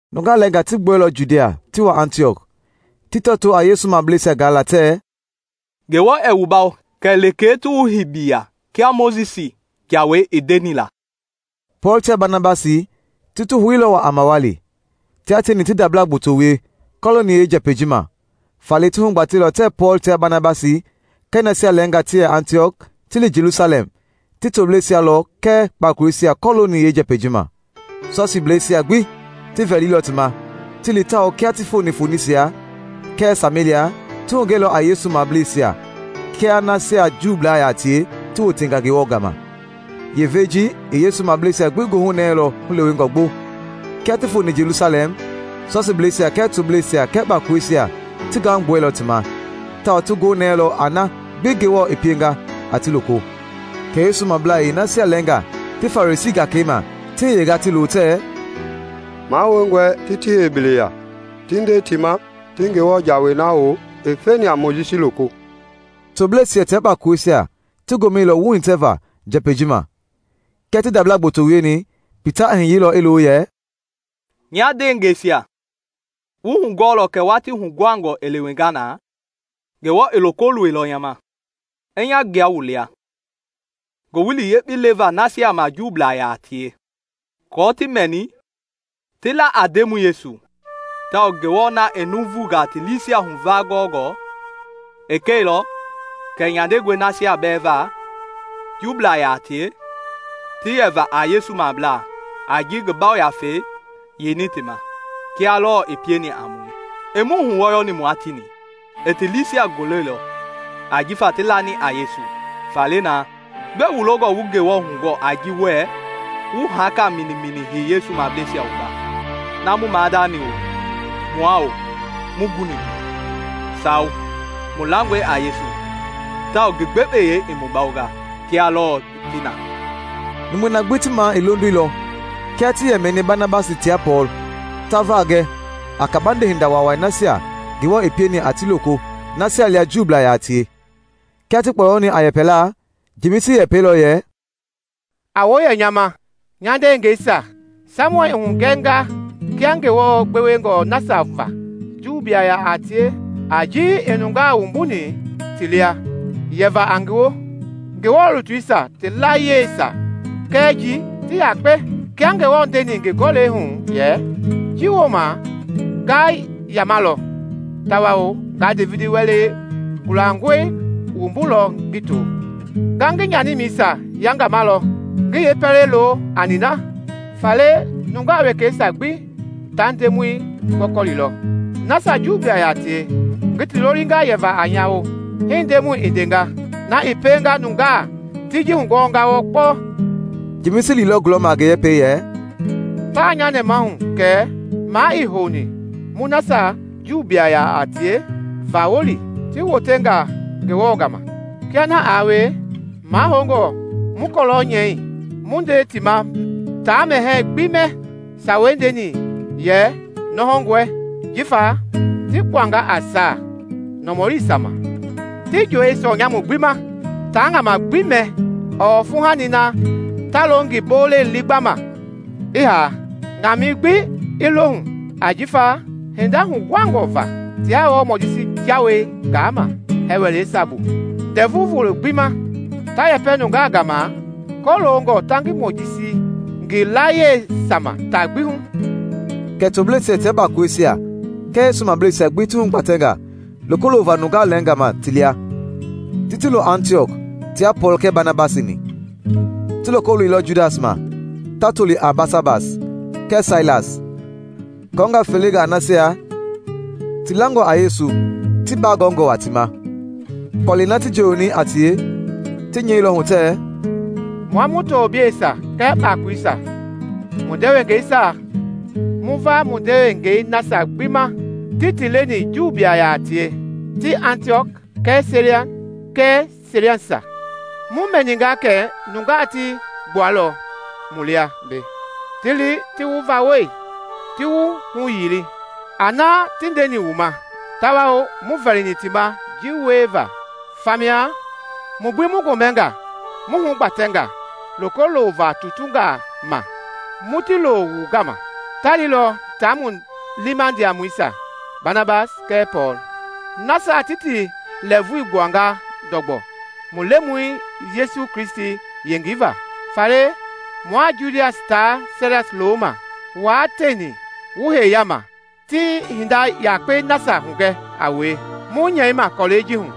Nungaa lɛɛngaa ti gbuɛilɔ Judia ti wa Antiɔk, ti tɔtoo a Yesu mableisia gaala tɛɛ, “Ngewɔ ɛɛ wu bawo kɛ lekee ti wu hei biliya kia Mojisi Jawei i ndeni la.” Pɔɔl tia Banabasi ti ti houilɔ waa a mawali, tia tieni ti ndabla gboto wie kɔlooni yeenjɛpɛi ji ma; faale ti hugbatɛilɔ tɛɛ Pɔɔl tia Banabasi kɛɛ nasia lɛɛngaa ti yɛ Antiɔk ti li Jelusalɛm ti tobleisia lɔ kɛɛ kpakoleisia kɔlooni yeenjɛpɛi ji ma. Sɔsiibleisia gbi ti vɛiilɔ ti ma ti li tawao kia ti foni Fonisia kɛɛ Samelia ti hugɛilɔ a Yesu mableisia kia nasia Juublaa yaa tie ti wotenga Ngewɔ gama; yeevei ji i Yesu mableisia gbi goohu nɛɛlɔ hulewengɔ gbo. Kia ti foni Jelusalɛm, Sɔsiibleisia kɛɛ tobleisia kɛɛ kpakoleisia ti gahu gbuɛilɔ ti ma, tawao ti gonɛilɔ a na gbi Ngewɔ i pienga a ti loko. Kɛ Yesu mablaa yeenasia lɛɛngaa ti Farisii gakei ma ti hiyenga ti lo tɛɛ, “Mahoungɔe ti ti hei biliya, ti nde ti ma ti Ngewɔ Jawei na hou i feni a Mojisi loko.” Tobleisia tia kpakoleisia ti gomɛilɔ wuhitɛva njɛpɛi ji ma. Kia ti ndabla gboto wieni, Pita i hiyeilɔ i lo yɛ, “Nya ndeengɛisia, wu hugɔɔlɔ kɛ watii huguhangɔ i lewenga na, Ngewɔ i loko loilɔ nya ma, i nya gbua wu lia Ngowili Yekpei leva nasia ma Juublaa yaa tie aako ti mɛni ti la a Ndemɔi Yesu. Tawao Ngewɔ na i nuuvungaa ti liisia huvaa gɔngɔ i kɛilɔ kɛ nyandengɔe nasia bɛɛ va Juublaa yaa tie ti yɛva a Yesu mablaa a ji i ngi Yafei yeini ti ma, kia lɔɔ i pieni a mue. Ii mu huwɔyɔni mua tieni; i ti liisia goleilɔ ajifa ti lani a Yesu. Faale na, gbɛe wu longɔ wu Ngewɔ hugɔɔ a ji wɛɛ wu haaka minimini hei Yesu mableisia wumba na mu maadani-o, mua-o, muii guni mbu? Sawo! Mu langɔe a Yesu tawao ngi gbekpeyei i mu bawonga, kia lɔɔ ti na.” Numui na gbi ti maa i londoilɔ kia ti yɛ mɛni Banabasi tia Pɔɔl ta va gɛ a kabande hinda waawai nasia Ngewɔ i pieni a ti loko nasia lia Juu yaa tie. Kia ti kpɔyɔni a yɛpɛlaa, Jemisi i yɛpɛilɔ yɛ, “A woo yɛ nya ma, nya ndeengɛisia! Saimɔn i hugɛnga kia Ngewɔ gbewengɔ nasia va Juublaa yaa tie a ji i nungaa wumbuni ti lia yɛva a ngi woo. Ngewɔ lutuisia ti layieisia kɛɛ ji, ti yakpe. Kia Ngewɔ ndeni ngi Gɔlɛi hu yɛ, ‘Ji wooma nga yamalɔ, tawao nga Devidi wɛlɛ gulangɔi wumbulɔ ngi to, Nga ngi nyanimɛisia yangamalɔ ngi yeepɛlei lo a nina. Faale nungaa wekeisia gbi ta Ndemɔi gɔkɔlilɔ, nasia Juublaa yaa tie ngi ti lolinga yɛva a nya woo. Hii Ndemɔi i ndenga, na i pienga nunga ti ji hugɔɔnga wɔɔ kpɔɔ.’” Jemisi liilɔ gulɔma a ngi yɛpɛi yɛ, “Taa nya nɛmahu kɛ maa ii houni mu nasia Juublaa yaa tie vawɔli ti wotenga Ngewɔ gama. Kia na aa wie, mahoungɔ mu kɔlɔ nyɛi mu nde ti ma taa mɛhɛɛ gbi mɛ sawei ndei yɛ nɔhɔngɔe jifa ti kpuanga a saa nɔmɔliisia ma; ti joowi sɔɔ nyamu gbi ma; taa ŋama gbi mɛ ɔɔ fuuhani na ta lo ngi bolei liigbama i haa, ŋamɛi gbi i lo hu. Ajifa hinda huguhangɔ va tiaa wɔɔ Mojisi Jawei gaama hɛɛ wɛleisia bu Ndɛvu Volo gbi ma, ta yɛpɛ nungaa gama kɔloongɔ ta ngi Mojisi ngi layieisia ma taa gbi hu.” Kɛ tobleisia tia kpakoleisia kɛɛ Yesu mableisia gbi ti hugbatɛnga loko lova nungaa lɛɛnga ma ti lia, ti ti lo Antiɔk tia Pɔɔl kɛɛ Banabasi-ni. Ti loko loilɔ Judas ma, ta toli a Basabas, kɛɛ Sailas, kɔɔnga felenga nasia ti langɔ a Yesu ti bagɔɔnga waa ti ma. Kɔlɛi na ti njooyoni a tie, ti nyɛilɔ hu tɛɛ, “Mua mu tobleisia kɛɛ kpakoleisia, wu ndewengeisia, mu va mu ndewengei nasia gbi ma ti ti leni Juublaa yaa tie ti Antiɔk kɛɛ Siria kɛɛ Silisia. Mu mɛninga kɛ nungaa ti gbuɛilɔ mu lia mbei ti li ti wu vawɔli, ti wu huyili a na ti ndeni wu ma; tawao muii vɛlini ti ma ji wieva. Famia mu gbi mu gomɛnga mu hugbatɛnga loko lova tutungaa ma mu ti lo wu gama. Ta lilɔ tia mu liima ndiamɔisia, Banabasi kɛɛ Pɔɔl, nasia ti ti lɛɛvui gbuanga ndɔgbɔ mu Lemɔi Yesu Kristi yengei va. Faale mua Judas tia Sailas loma, wua tieni wu hei yaama ti hinda yakpei nasia hugɛ a wue mu nyɛima kɔlɛi ji hu.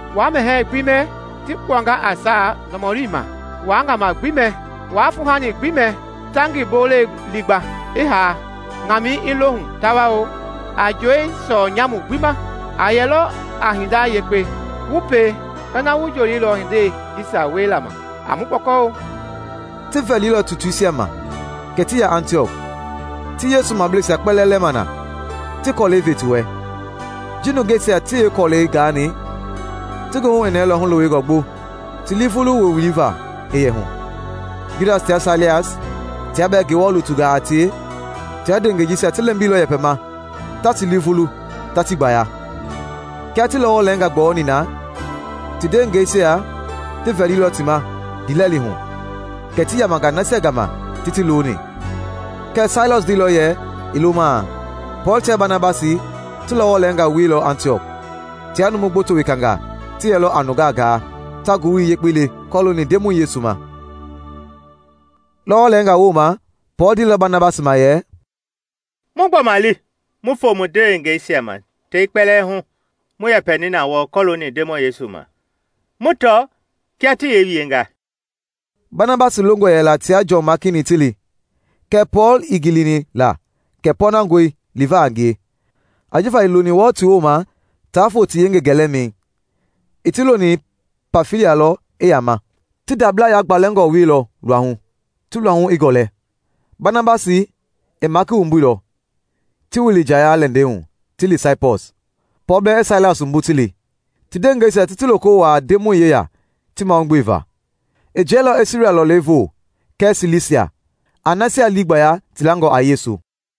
waa mɛhɛɛ gbi mɛ ti kpuanga a saa nɔmɔlingaa ma; waa ŋama gbi mɛ; waa fuuhani gbi mɛ ta ngi bolei liigba, i haa, ŋamɛi i lo hu; tawao a joowi sɔɔ-nyamu gbi ma. A yɛlɔ a hinda yekpe wu pie ina wu joowiilɔ hindei jisia wiela ma. A mu kpɔkɔ-o.” Ti vɛlilɔ tutuisia ma kɛ ti ya Antiɔk, ti Yesu mableisia kpɛlɛɛ lɛma na, ti kɔlɛi ve ti wɛ. Ji nungeisia ti yeekɔlɛi gaani, ti goohu i nɛɛlɔ hulewengɔ gbo ti lii vulu woowili va i yɛ hu. Judas tia Sailas, tia bɛɛ Ngewɔ lutungaa a tie, tia ndewengei jisia ti lɛmbilɔ yɛpɛma, ta ti lii vulu, ta ti gbaya. Kia ti lɔwɔ lɛɛngaa gbɔyɔni na, ti ndewengeisia ti vɛlilɔ ti ma ndiilɛli hu, kɛ ti yamanga nasia gama ti ti loni. [ Kɛɛ Sailas ndeilɔ yɛ i lomaa.] Pɔɔl tia Banabasi ti lɔwɔ lɛɛnga wieilɔ Antiɔk. Tia numu gboto wekangaa ti yɛlɔ a nungaa gaa, ta Ngowili Yekpei le kɔlooni Ndemɔi Yesu ma. Lɔwɔ lɛɛnga wooma Pɔɔl ndeilɔ Banabasi ma yɛ, “Mu gbɔma li mu foo mu ndewengeisia ma tei kpɛlɛɛ hu mu yɛpɛni na wɔɔ kɔlooni Ndemɔi Yesu ma, mu tɔ kia ti yee wienga.” Banabasi longɔ yɛla tia Jɔn Maaki-ni ti li, kɛɛ Pɔɔl ii gilini la kɛ pɔɔnangɔe liva a ngie, ajifa ii loni wɔɔ ti wooma taa foo ti yengei gɛlɛmɛi, i ti loni Pamfilia lɔ i yaama. Ti ndabla yagbalɛngɔ wieilɔ luahu, ti luahu i gɔlɛ. Banabasi i Maaki wumbuilɔ, ti wili njaya-lɛndɛi hu ti li Saipɔs, Pɔɔl bɛɛ i Sailas wumbu ti li, ti ndewengeisia ti ti loko wuaa Ndemɔi yeya ti mahaugbeevaa. I jiɛilɔ i Siria lɔlei voo kɛɛ Silisia, a nasia lii gbaya ti langɔ a Yesu.